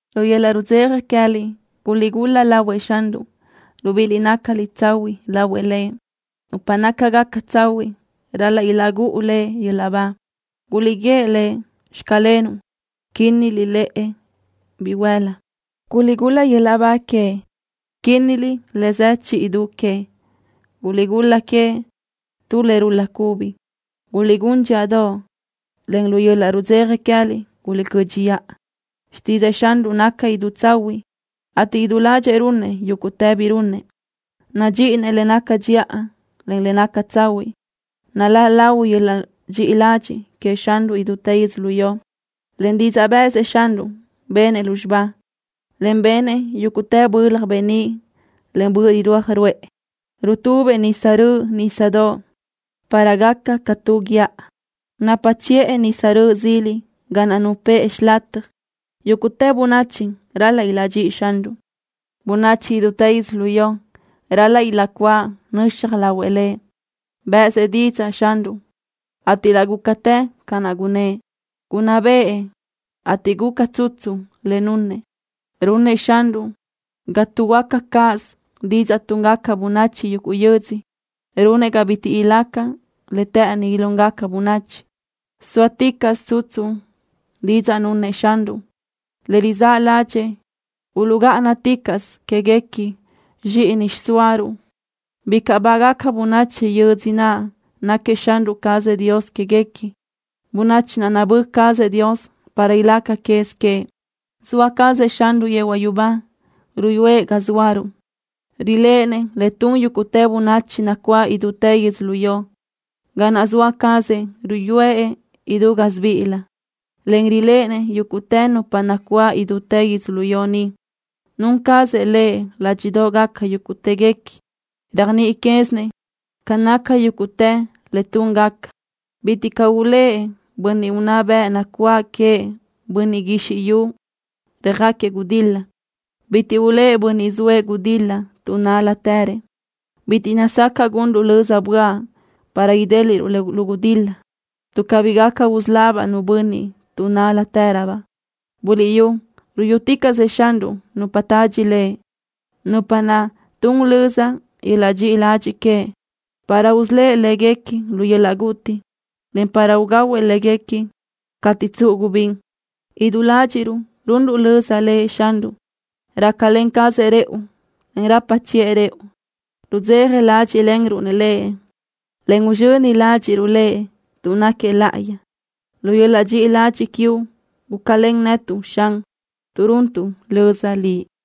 Lu yöl-laʼ rudzeja queë́liʼ guliʼgul-la lahuëʼ Xanruʼ, libíʼiliʼ nácaliʼ tsahuiʼ lahuëʼ Lëʼ. Nupa nácagaca tsahuiʼ ral-laʼ ilaʼgúʼu Lëʼ yöl-laʼ ba. Guliʼguíëʼ Lëʼ: “Xclenuʼ”, quínniliʼ lëʼe bihuél-la. Guliʼgul-la yöl-laʼ ba queëʼ, quínniliʼ le zë chi du que. Guliʼgul-la queëʼ tu le rul-la cubi. Guliʼquinnaj dxíʼadoʼ, en lu yöl-laʼ rudzeja queë́liʼ guliʼcö́dxiʼa. Xtídzëʼë Xanruʼ naca idú tsahuiʼ, ateʼ idú ládxëʼë runëʼ yúguʼtë bi runëʼ. Nadxíʼinëʼ le naca dxiʼa, en le naca tsahuiʼ. Naláʼ lahui yöl-laʼ dxiʼi ladxiʼ queëʼ Xanruʼ idútë yödzölió. Len didzaʼ bë́ʼësëʼ Xanruʼ, benëʼ lúzxiba, en benëʼ yúguʼtë bölaj beníʼ len böʼ rirúaj ruʼë. Rutubëʼ nisa röʼö nísadoʼ para gaca ca tu guíʼa. Napa chiʼë nisa röʼö zili ga naʼ nupë́ʼë xilataj. Yúguʼtë bönachi ral-laʼ ilaʼdxíʼi Xanruʼ. Bönachi idútë yödzölió ral-laʼ ilaʼcuáʼ nöxaj lahuëʼ Lëʼ. Bë́ʼësëʼ didzaʼ Xanruʼ, ateʼ laʼ gúcatë ca naʼ gunnë́ʼ. Gunná bëʼë, ateʼ guca tsutsu le nunëʼ. Runëʼ Xanruʼ ga tuʼhuöáca cáʼasö didzaʼ túngaca bönachi yuguʼ yödzö. Runëʼ ga bitiʼ ilaca le të́ʼëni ilúngaca bönachi. Sóaticaʼsö tsutsu didzaʼ nunëʼ Xanruʼ. Le rizáʼ ládxëʼë uluʼgáʼanaticaʼsö quéguequi zxíʼini xiʼsóaruʼ. Bicaʼ bágaca bönachi yödzö naʼ náquiëʼ Xanruʼ cazëʼ Dios quéguequi, bönachi naʼ nabö́ cazëʼ Dios para ilaca quez queëʼ. Zoa cazëʼ Xanruʼ yehuaʼ yubá, ruyúëʼ ga zóaruʼ. Riléʼenëʼ le tun yúguʼtë bönachi nacuáʼ idútë yödzölió. Ga naʼ zoa cazëʼ ruyúëʼ idú gásibiʼilö, en riléʼenëʼ yúguʼtë nupa nacuáʼ idútë yödzölió ni. Nun cazëʼ Lëʼ ládxiʼdoʼgaca yúguʼtëguequi. Réajniʼi quézinëʼ ca naca yúguʼtë le túngaca. Bitiʼ caʼ ulë́ʼ bönniʼ unná bëʼ nacuáʼ queëʼ bönniʼ guizxi yu röjáquiëʼ gudil-la. Bitiʼ ulë́ʼ bönniʼ zoëʼ gudil-la tuʼ nál-latërëʼ. Bitiʼ nazacaʼ gunruʼ löza böaʼ para idéliʼruʼ lu gudil-la, tuʼ cabí gaca usölabaʼ nu bönniʼ tuʼ nál-latëröbaʼ. Buliʼyú, ruyúticaʼsëʼ Xanruʼ nupa tadxi Lëʼ, nupa naʼ tun löza yöl-laʼ dxiʼi ladxiʼ queëʼ, para usölë́ʼ léguequi lu yöl-laʼ guti, en para ugahuëʼ léguequi cateʼ tsuʼu gubín. Idú ládxiʼruʼ runruʼ löza Lëʼ Xanruʼ. Rácalen cazëʼ rëʼu, en rapa chiʼë rëʼu. Rudzeja ládxiʼlenruʼ Lëʼ, en uzxöni ládxiʼruʼ Lëʼ, tuʼ náquiëʼ láʼayi. Lu yöl-laʼ dxiʼi ladxiʼ quiuʼ gúcalen netuʼ, Xan, tuʼ runtuʼ löza Liʼ.